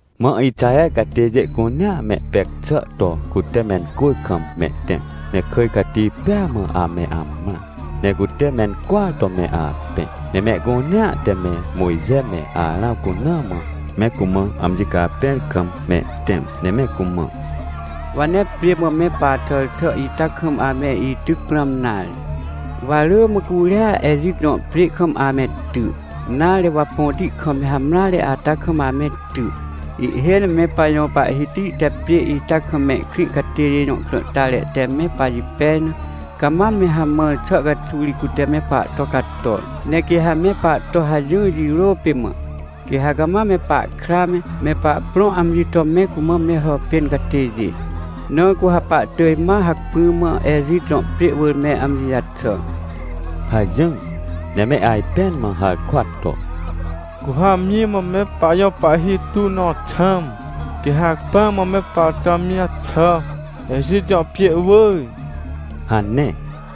Mã Ixaher catêjê cunea mehpec xà to cute mencwỳr kam mehtẽm. Ne kỳj cati pêa mã ame amrã, ne cute mencwỳar to me apẽ. Ne mehcunea te me Mojxe me Arãw cuna mã me cumã amji capẽr kam mehtẽm, ne me cumã: — Wa nee pjê mã me paxàr xà ita kam ame ityc prãm nare. Wa rỳ mã curia Ejit jõ pjê kam ame ty. Nare, wa põti kam me hamreare ata kam ame ty. Ihhêj ne me pajõ Pahhiti te pjê ita kam mehkrĩ catêjê jõ krãhtare te me pajipej na, cama me hamãr xà caxuw ri cute me pahto cator. Ne quê ha me pahto hajỹr jirô pê mã, quê ha cama me pahkra me, me pahprõ amji to me cumã me hàpên catêjê. Na cu ha pahtỳj ma hacpỹ mã Ejit jõ pjê wỳr me amji jaxà — hajỹr. Ne me ajpẽn mã harkwa to: — Cu ha amji mã me pajõ pahhi tuw nõ xãm, quê ha hacpỹa mã me pahto amji jaxà, Ejit jõ pjê wỳr — hane.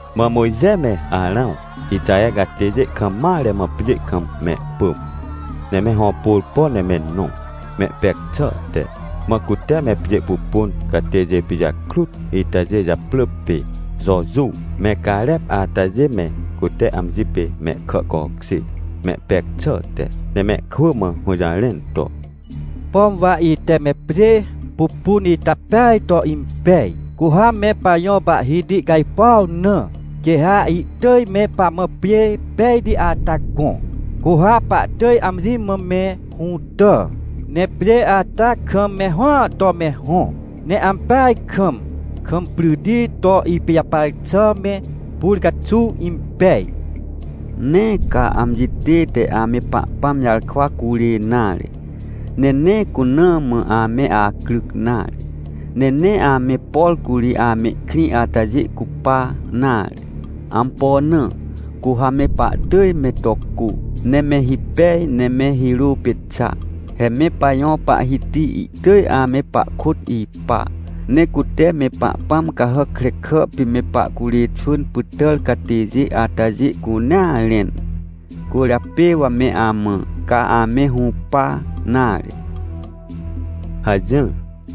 Mã Mojxe me Arãw, Ixaher catêjê kam mare mã pjê kam mehpỳm, ne me hõpôrpo ne me nõ, mehpec xàhte. Mã cute me pjê pupun catêjê pijakrut itajê japrỳ pê Jojuw, me Carep atajê me cute amji pê mehkà cokjêr, mehpec xàhte, ne mehkwỳ mã hũjarẽn to: — Pom wa ite me pjê pupun ita peaj to impej. Cu ha me pajõ Pahhiti cajpuaw na, quê ha ihtỳj me pamã pjê pejti ata gõ, cu ha pahtỳj amji mã me hũtà. Ne pjê ata kam me hõa to me hõ, ne ampeaj kam, kam pryti to ipijapar xà me, pur caxuw impej. Nee ca amji tête ame Pahpãm jarkwa curê nare. Ne nee cuna mã ame acryc nare, ne nee ame, por curi amehkrĩ atajê cupa nare. Ampo na? Cu ha me pahtỳj me to cô, ne me hipej ne me hirô pê xa. He me pajõ Pahhiti ihtỳj ame pahkôt ipa, ne cute me pahpãm cahàc krekà pê me pahcurê xwỳn pytàr catêjê atajê cunea rẽn. Cwỳrjapê wa me amã, ca ame hũpa nare — hajỹr.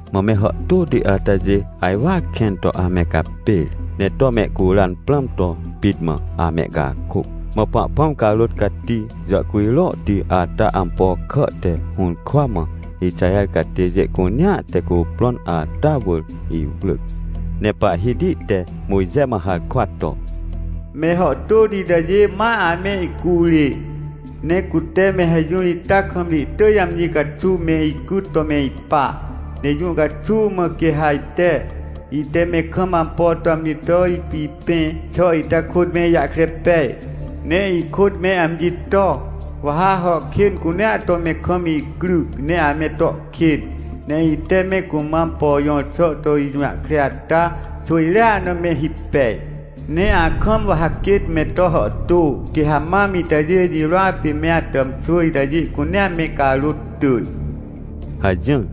Mã me hàhtôti atajê ajwar kẽn to ame capêr, ne to mehcuran prãm to pit mã amehcakôc. Mã Pahpãm carôt cati jàhcujrohti ata ampo kà te hũrkwa mã Ixaher catêjê cunea te cuprõn ata wỳr iwrỳc, ne Pahhiti te Mojxe mã harkwa to: — Me hàhtôti itajê ma ame icurê! Ne cute me hajỹr ita kam ri ihtỳj amji caxuw me icyt to me ipa. Ne jũ caxuw mã quê ha ajte, ite me kam ampo to amji to ipipẽ xà ita kôt me ijahkre pej, ne ikôt me amji to? Wa ha hà kên cunea to me kam icryc, ne ame to kên, ne ite me cumã ampo jõr xà to ijũjahkre ata xwỳjrea na me hipej. Ne akam wa ha quêt me to hàhtô, quê ha mam itajê jirôa pê me atàmxwỳ itajê cunea me carôt tỳj — hajỹr.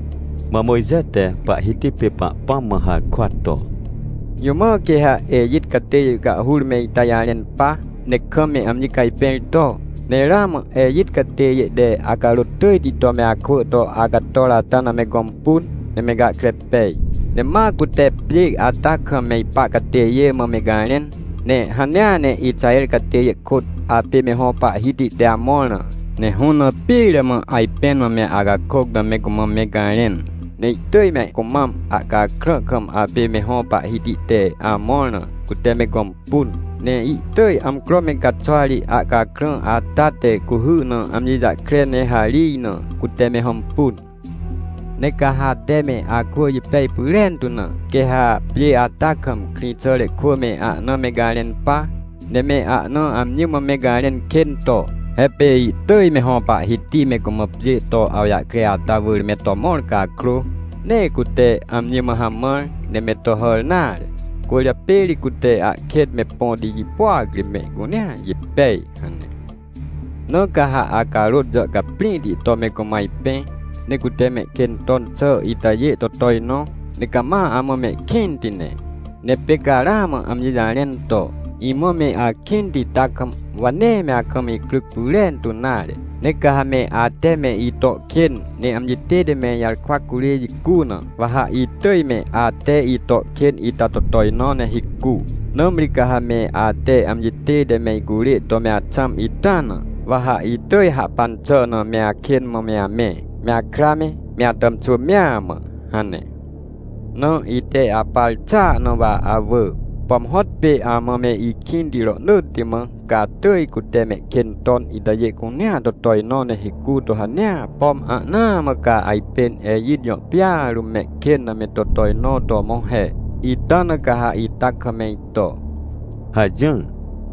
Mã Mojxe te Pahhiti pê Pahpãm mã harkwa to: — Jũ mã quê ha Ejit catêjê cahhur me ita jarẽn pa, ne kam me amji cajpẽr to? Ne ramã Ejit catêjê te acarôt tỳjti to me akwỳ to acator ata na me gõmpun, ne me gahkre pej. Ne ma cute pjê ata kam me ipa catêjê mã me garẽn. Ne hanea ne Ixaher catêjê kôt apê me hõ Pahhiti te amõr na, ne hũ na pire mã ajpẽn mã me acakôc na me cumã me garẽn. Ne ihtỳj me cumam ahcakrã kam apê me hõ Pahhiti te amõr na, cute me gõmpun. Ne ihtỳj amcro me caxwa ri ahcakrã ata te cuhy na amji jahkre ne harij na, cute me hõmpun. Ne ca ha ate me akwỳ jipej pyrentu na, quê ha pjê ata kam, krĩxàre kwỳ me ahna me garẽn pa, ne me ahna amji mã me garẽn kên to, “He pê ihtỳj me hõ Pahhiti me cumã pjê to awjahkre ata wỳr me to mõr cakrô, nee cute amji mã hamãr, ne me to hàr nare. Cwỳrjapê ri cute ahkêt me põti jipôac ri mehcunea jipej” hane. — Na ca ha acarôt jàhcaprĩhti to me cumã ajpẽ, ne cute mehkên ton xà itajê to tojnõ, ne cama amã mehkĩnti ne. Ne pê ca ramã amji jarẽn to: “Imã me akĩnti ita kam, wa nee me akam icryc pyrentu nare, ne ca hame ate me ito kên, ne amji tête me ijarkwa curê jicu na, wa ha itỳj me ate ito kên ita to tojnõ ne hicu. Nãmri ca ha me ate amji tête me icurê to me axãm ita na, wa ha itỳj hahpan xà na me akên mã me amẽ, me akra me, me atàmxwỳ mea mã” hane. — Na ite apar xàa na wa awỳ, pom hõtpê amã me ikĩnti rohnỳtti mã, ca atỳj cute mehkên ton itajê cunea to tojnõ ne hicu to hanea, pom ahnaa mã ca ajpên Ejit jõ pjêa rũm mehkên na me to tojnõ to mõ he, ita na ca ha ita kam me ito — hajỹr.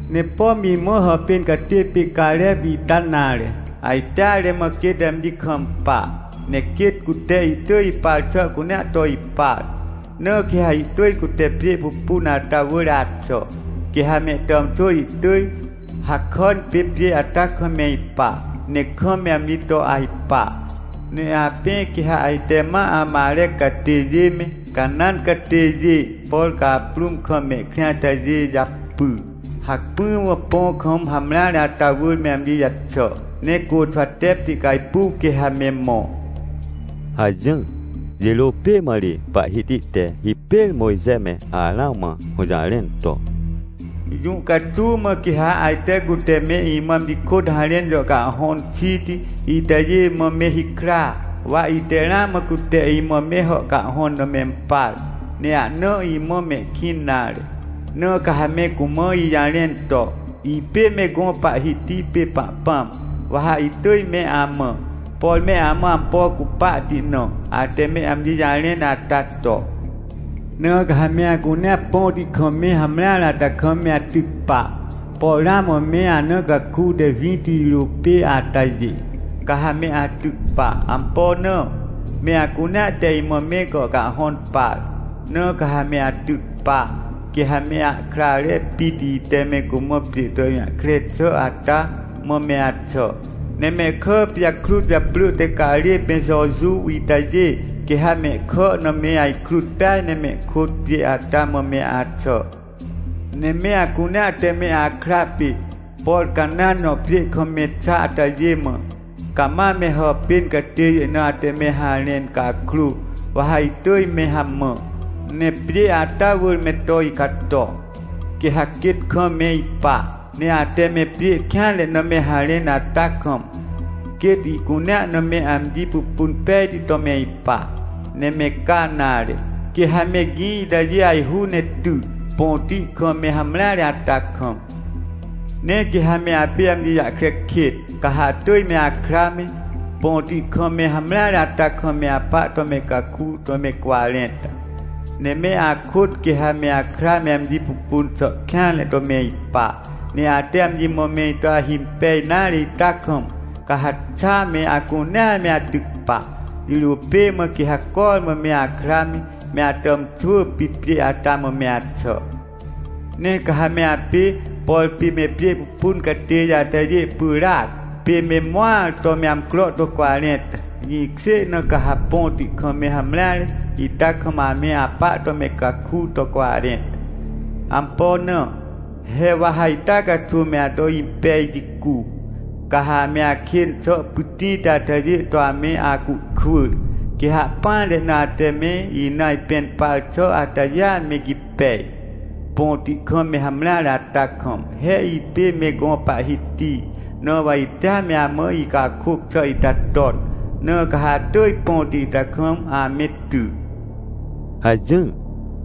— Ne pom imã hàpên catê pê Carep ita nare, ajteare mã quêt amji kampa, ne quêt cute ihtỳj ipar xà cunea to ipar. Na quê ha ihtỳj cute pjê pupun ata wỳr axà, quê ha mehtàmxwỳ ihtỳj hakàn pê pjê ata kam me ipa, ne kam me amji to ajpa. — Ne apẽ quê ha ajte ma Amarec catêjê me, Canãn catêjê, por caprũm kam mehkrĩ atajê japy, hacpỹ mã põ kam hamreare ata wỳr me amji jaxà. Ne Côxwatepti cajpuw quê ha me mõ — hajỹr. Jirô pê mã ri Pahhiti te hipêr Mojxe me Arãw mã hũjarẽn to: — Jũ caxuw mã quê ha ajte cute me imã amji kôt harẽn jàhcahhõn xiti itajê mã me hikra? Wa ite ramã cute imã me hàhcahhõn na mempar, ne ahna imã mehkĩn nare. Na ca ha me cumã ijarẽn to: “Ipê me gõ Pahhiti pê Pahpãm. Wa ha itỳj me amã, por me amã ampo cupahti na, ate me amji jarẽn ata to. Na ca ha me acunea põti kam me hamreare ata kam me atyc pa, por ramã me ana caku te winti jirô pê atajê, ca ha me atyc pa. Ampo na? Me acunea te imã me gàhcahhõn par, na ca ha me atyc pa, quê ha me ahkrare pit ite me cumã pjê to ijũjahkre xà ata mã me axà. Ne mehkà pijakrut japrỳ te Carep me Jojuw itajê, quê ha mehkà na me ajkrut peaj ne mehkôt pjê ata mã me axà. “Ne me acunea te me akra pê, por Canãn jõ pjê kam me xa atajê mã, cama me hàpên catêjê na ate me harẽn cakrô, wa ha itỳj me hamã, ne pjê ata wỳr me to icato, quê ha quêt kam me ipa. Ne ate me pjê kêanre na me harẽn ata kam, quêt ihcunea na me amji pupun pejti to me ipa. Ne me ca nare. Quê ha me gĩ itajê ajhu ne ty, põti kam me hamreare ata kam. Ne quê ha me apê amji jahkre kêt, ca ha atỳj me akra me, põti kam me hamreare ata kam me apa to me caku to me cwarẽnta. Ne me akôt quê ha me akra me amji pupun xà kêanre to me ipa, ne ate amji mã me ito ahimpej nare ita kam, ca ha xa me acunea me atyc pa, jirô pê mã quê ha cormã me akra me, me atàmxwỳ pit pjê ata mã me axà. “Ne ca ha me apê, por pê me pjê pupun catêjê atajê pyràac, pê me mõar to me amcro to cwarẽnta, jĩkjê na ca ha põti kam me hamreare ita kam ame apa to me caku to cwarẽnta. Ampo na? He wa ha ita caxuw me ato impej jicu, ca ha ame akên xà pytĩti atajê to ame acuhkwỳr. Quê ha ahpỹanre na ate me ina ajpẽn par xà atajêa me gipej, põti kam me hamreare ata kam. He ipê me gõ Pahhiti, na wa itea me amã icakôc xà ita ton, na ca ha atỳj põti ita kam ame ty” — hajỹr.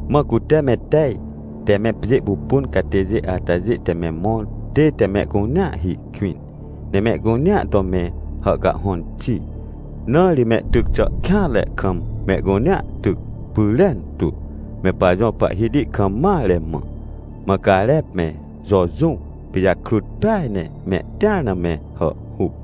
Mã cute me tej te me pjê pupun catêjê atajê te me mõr tête mehcunea hi kwĩn, ne mehcunea to me hàhcahhõn xi, na ri mehtyc xà kêanre kam mehcunea tyc pyrentu, me pajõ Pahhiti kam mare mã. Mã Carep me Jojuw pijakrut peaj ne mehtĩar na me hàhhuc.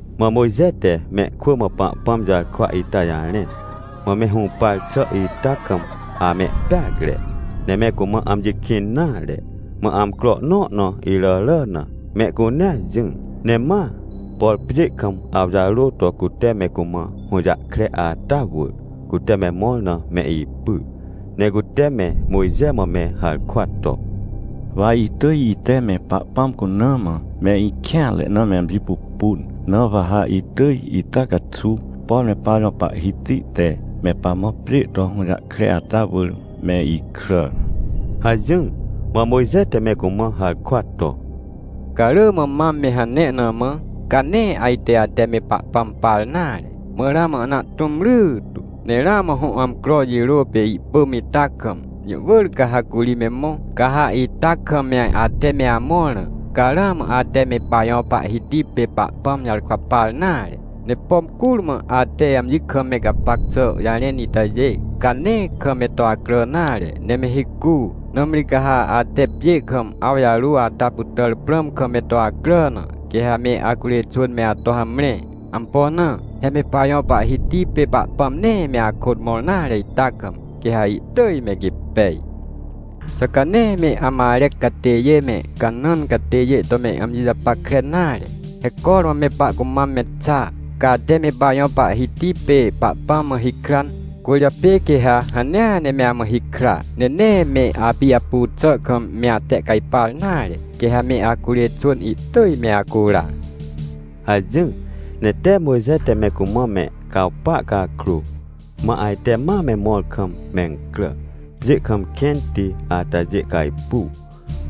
Mã Mojxe te mehkwỳ mã Pahpãm jarkwa ita jarẽn, mã me hũpar xà ita kam amehpeacre, ne me cumã amji kĩn nare. Mã amcro nõ na iràrà na mehcunea jỹr, ne ma, por pjê kam awjarô to cute me cumã hũjahkre ata wỳr, cute me mõr na me ipyr. Ne cute me Mojxe mã me harkwa to: — Wa itỳj ite me Pahpãm cuna mã me ikêanre na me amji pupun, na wa ha itỳj ita caxuw, por me pajõ Pahhiti te me pamã pjê to hũjahkre ata wỳr me ikràr — hajỹr. Mã Mojxe te me cumã harkwa to: — Ca rỳ mã mam me hane na mã, ca nee ajte ate me Pahpãm par nare. Mã ramã ahna ahtũm rytu, ne ramã hõ amcro jirô pê ihpỳm ita kam, jũ wỳr ca ha curi me mõ. Ca ha ita kam me ate me amõr na, ca ramã ate me pajõ Pahhiti pê Pahpãm jarkwa par nare. Ne pom curmã ate amji kam me gapac xà jarẽn itajê, ca nee kam me to acrà nare, ne me hicu. Nãmri ca ha ate pjê kam awjarô ata pytàr prãm kam me to acrà na, quê ha me acurê xwỳn me ato hamre. Ampo na? He me pajõ Pahhiti pê Pahpãm nee me akôt mõr nare ita kam, quê ha ihtỳj me gipej. Xà ca nee me Amarec catêjê me, Canãn catêjê to me amji japackre nare? He cormã me pahcumam me xa! Ca ate me pajõ Pahhiti pê Pahpãm mã hikran, cwỳrjapê quê ha hanea ne me amã hikra, ne nee me apijapu xà kam me atehcajpar nare, quê ha me acurê xwỳn ihtỳj me acura — hajỹr. Ne tee Mojxe te me cumã me cawpa cakrô, mã ajte ma me mõr kam mencrà, pjê kam kẽnti atajê cajpuw.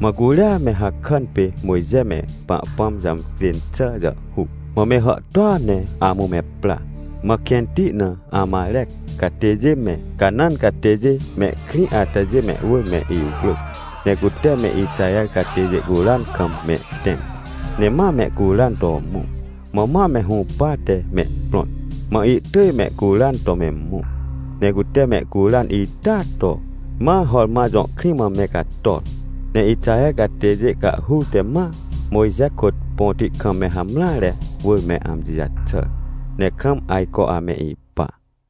Mã curia me hakàn pê Mojxe me Pahpãm jàmcjên xà jàhhuc, mã me hàhtôa ne amũ me pra. Mã kẽnti na Amarec catêjê me, Canãn catêjê mehkrĩ atajê mehwỳr me iwrỳc, ne cute me Ixaher catêjê curan kam mehtẽm, ne ma mehcuran to mõ. Mã ma me hũpate mehprõt. Mã ihtỳj mehcuran to me mõ, ne cute mehcuran itaa to, ma Horma jõ krĩ mã me cator. Ne Ixaher catêjê cahhur te ma Mojxe kôt põti kam me hamreare wỳr me amji jaxàr, ne kam ajco ame ipa.